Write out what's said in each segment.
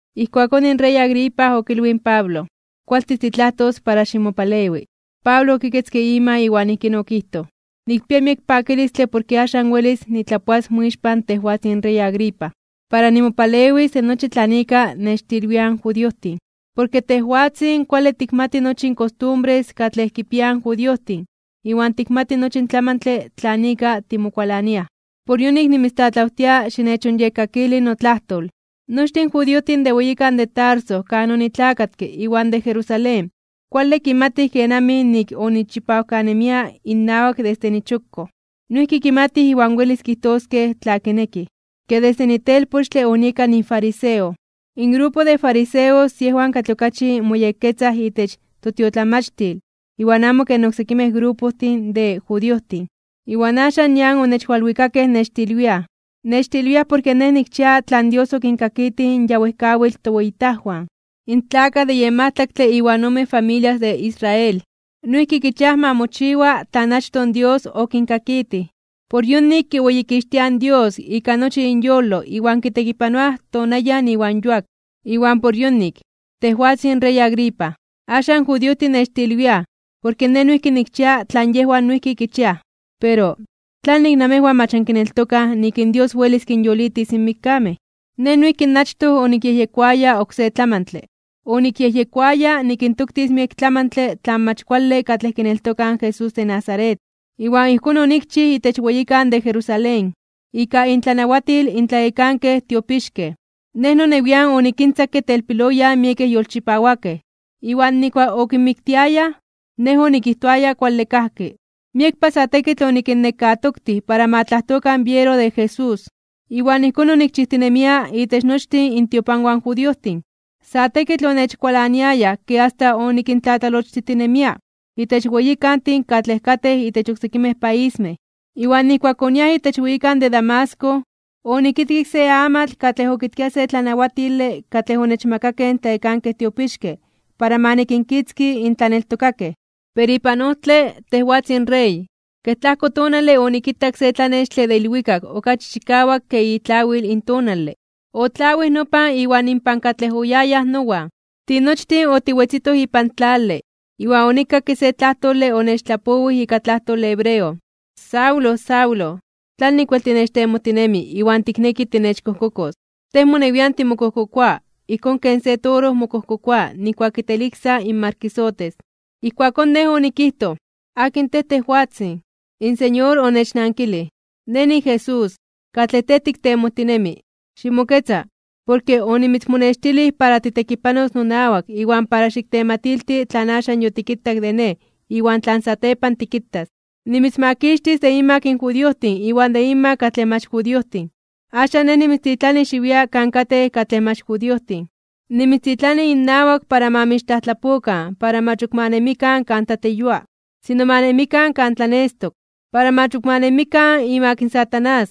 Ijkuakón in rey Agripa okilwij in Pablo: ―Kualtis titlajtos para ximopalewi. Pablo okiketzke ima iwan ijkín okijtoj: ―Nikpia miek pakilistle porke axan welis nitlapoas moixpan tejwatzin rey Agripa, para nimopalewis de nochi tlan ika nechtilwiaj in judiojtin. Porke tejwatzin kuale tikixmati nochi in kostumbres katlej kipiaj in judiojtin iwan tikmati nochi in tlamantle tlan ika timokualaniaj. Por yonik nimitztlatlawtia xinechonyekkakili notlajtol. ’Nochtin in judiojtin de weyikan de Tarso kan onitlakatke iwan de Jerusalén kuale kimatij kenamij nik onichipawkanemia innawak desde nichokkoj. Noijki kimatij iwan welis kijtoskej tla kinekij, ke desde nitelpochtle onieka nifariseo. In grupo de fariseos yejwan katlej okachi moyekketzaj itech totiotlamachtil iwan amo ken oksekimej grupojtin de judiojtin. Iwan axan nian onechwalwikakej nechtilwiaj. Nechtilwiaj porke nej nikchia tlan Dios okinkakitij in ya wejkawitl toweyitajwan. In tlakaj de yen majtlaktle iwan ome familias de Israel, noijki kichiaj ma mochiwa tlan achtoj in Dios okinkakitij. Por yonik kiweyikixtiaj in Dios ika nochi inyolo iwan kitekipanoaj tonayan iwan yuak. Iwan por yonik, tejwatzin rey Agripa, axan in judiojtin nechtilwiaj porke nej noijki nikchia tlan yejwan noijki kichiaj. Pero, ¿tlanik namejwan mach ankineltokaj nik in Dios welis kinyolitis in mikkamej? ’Nej noijki achtoj onikyejyekoaya oksé tlamantle. Onikyejyekoaya nikintoktis miek tlamantle tlan mach kuale katlej kineltokaj in Jesús de Nazaret. Iwan ijkón onikchij itech weyikan de Jerusalén. Ika intlanawatil in tlayekankej tiopixkej, nej nonewian onikintzakke telpiloyan miekej yolchipawakej, iwan nijkuak okinmiktiayaj nej onikijtoaya kuale kajki. Miekpa sa tekitl onikinnekatoktij para ma tlajtokan biero de Jesús. Iwan ijkón onikchijtinemia itech nochtin intiopanwan in judiojtin. Sa tekitl onechkualaniayaj ke asta onikintlatlalochtijtinemia itech weyikantin katlej katej itech oksekimej paismej. ’Iwan nijkuak oniaj itech weyikan de Damasco, onikitkik se amatl katlej okitkia se tlanawatile katlej onechmakakej in tlayekankej tiopixkej para ma nikinkitzki in tlaneltokakej. Pero ipan ojtle, tejwatzin rey, kej tlajko tonale onikitak se tlanextle de ilwikak okachi chikawak ke itlawil in tonale, otlawij nopan iwan inpan katlej oyayaj nowan. Tinochtin otiwetzitoj ipan tlale, iwan onikakke se tlajtole onechtlapowij ika tlajtole hebreo: “Saulo, Saulo, ¿tlanik wel tinechtemojtinemi iwan tikneki tinechkojkokos? Tej monewian timokojkokoa ijkón ken se toro mokojkokoa nijkuak kitejteliksa in markisotes.” Ijkuakón nej onikijtoj: “¿Akin tej, tejwatzin?” In Señor onechnankilij: “Nej niJesús, katlej tej tiktemojtinemi. Ximoketza, porke onimitzmonextilij para titekipanos nonawak iwan para xiktematilti tlan axan yotikitak de Nej iwan tlan satepan tikitas. Nimitzmakixtis de inmak in judiojtin iwan de inmak katlej mach judiojtin. Axan Nej nimitztitlani xiwia kan katej katlej mach judiojtin. Nimitztitlani innawak para ma mixtlajtlapokan para mach ok ma nemikan kan tlatleyua, sino ma nemikan kan tlanestok. Para mach ok ma nemikan imak Satanás,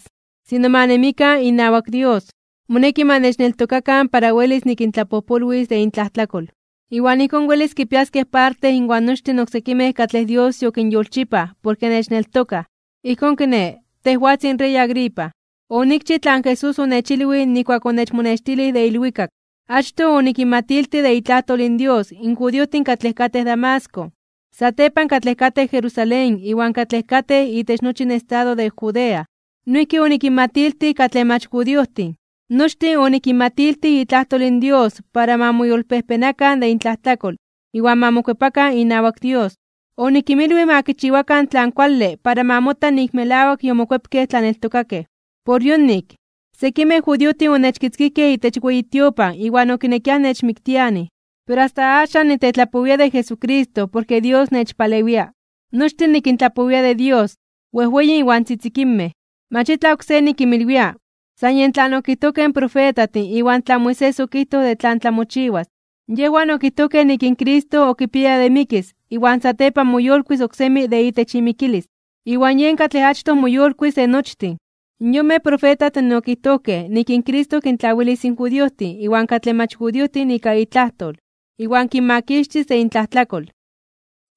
sino ma nemikan inawak Dios. Moneki ma nechneltokakan para welis nikintlapojpolwis de intlajtlakol, iwan ijkón welis kipiaskej parte inwan nochtin in oksekimej katlej Dios yokinyolchipaj porke nechneltokaj.” ’Ijkón kiné, tejwatzin rey Agripa, onikchij tlan Jesús onechilwij nijkuak onechmonextilij de ilwikak. Achtoj onikinmatiltij de itlajtol in Dios in judiojtin katlej katej Damasco, satepan katlej katej Jerusalén iwan katlej katej itech nochi in estado de Judea. Noijki onikinmatiltij katlej mach judiojtin. Nochtin onikinmatiltij itlajtol in Dios para ma moyolpejpenakan (ma moyolkuepakan) de intlajtlakol iwan ma mokuepakan inawak Dios. Onikinmilwij ma kichiwakan tlan kuale para ma mota nik melawak yomokuepkej tlaneltokakej. Por yonik, sekimej judiojtin onechkitzkijkej itech weyi tiopan iwan okinekiaj nechmiktianij. Pero asta axan nitetlapowia de Jesucristo porke Dios nechpalewia. Nochtin nikintlapowia de Dios, wejweyin iwan tzitzikinmej, mach itlaj oksé nikinmilwia, san yej tlan okijtojkej in profetajtin iwan tlan Moisés okijtoj de tlan tlamochiwas. Yejwan okijtojkej nik in Cristo okipiaya de mikis iwan satepan moyolkuis (moyolitis) oksemi de itech imikilis. Iwan yen katlej achtoj moyolkuis de nochtin. Yonmej profetajtin okijtojkej nik in Cristo kintlawilis in judiojtin iwan katlej mach judiojtin ika itlajtol, iwan kinmakixtis de intlajtlakol.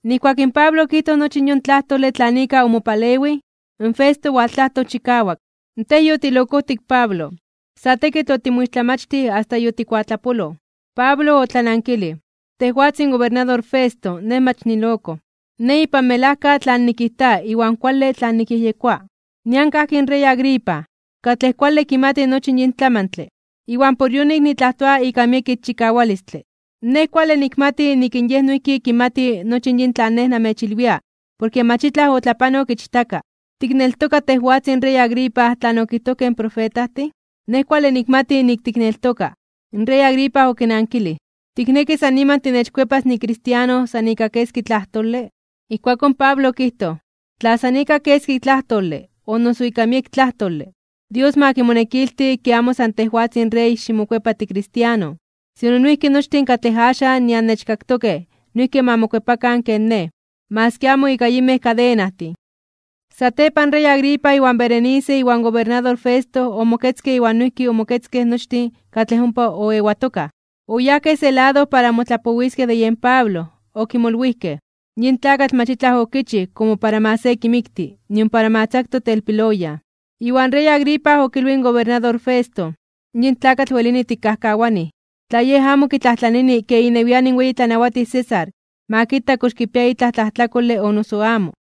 Nijkuak in Pablo okijtoj nochi yon tlajtole tlan ika omopalewij, in Festo owaltlajtoj chikawak: ―¡Tej yotilokojtik Pablo! Sa tekitl otimoixtlamachtij asta yotikuatlapoloj. Pablo otlanankilij: ―Tejwatzin gobernador Festo, nej mach niloko. Nej ipan melajka tlan nikijta iwan kuale tlan nikyejyekoa. Nian kajki in rey Agripa, katlej kuale kimati nochi yin tlamantle, iwan por yonik nitlajtoa ika miek ixchikawalistle. Nej kuale nikmati nik in yej noijki kimati nochi yin tlan nej namechilwia porke mach itlaj otlapanok ichtaka. ¿Tikneltoka tejwatzin rey Agripa tlan okijtojkej in profetajtin? Nej kuale nikmati nik tikneltoka. In rey Agripa okinankilij: ―¿Tikneki san niman tinechkuepas nikristiano san ika keski tlajtole? Ijkuakón Pablo okijtoj: ―Tla san ika keski tlajtole o noso ika miek tlajtole, Dios ma kimonekilti ke amo san tejwatzin rey ximokuepa tikristiano, sino noijki nochtin katlej axan nian nechkaktokej noijki ma mokuepakan ken nej, maski amo ika yinmej kadenajtin. Satepan in rey Agripa iwan Berenice iwan gobernador Festo omoketzkej iwan noijki omoketzkej nochtin katlej ompa oewatokaj. Oyajkej se lado para motlapowiskej de yen Pablo. Okimolwijkej: ―Yin tlakatl mach itlaj okichij komo para ma se kimikti, nion para tzaktos telpiloyan. Iwan rey Agripa okilwij in gobernador Festo: ―Yin tlakatl welini tikkajkawanij, tla yej amo kitlajtlanini ke inewian in weyi tlanawatij César ma kita kox kipia itlaj tlajtlakole o noso amo.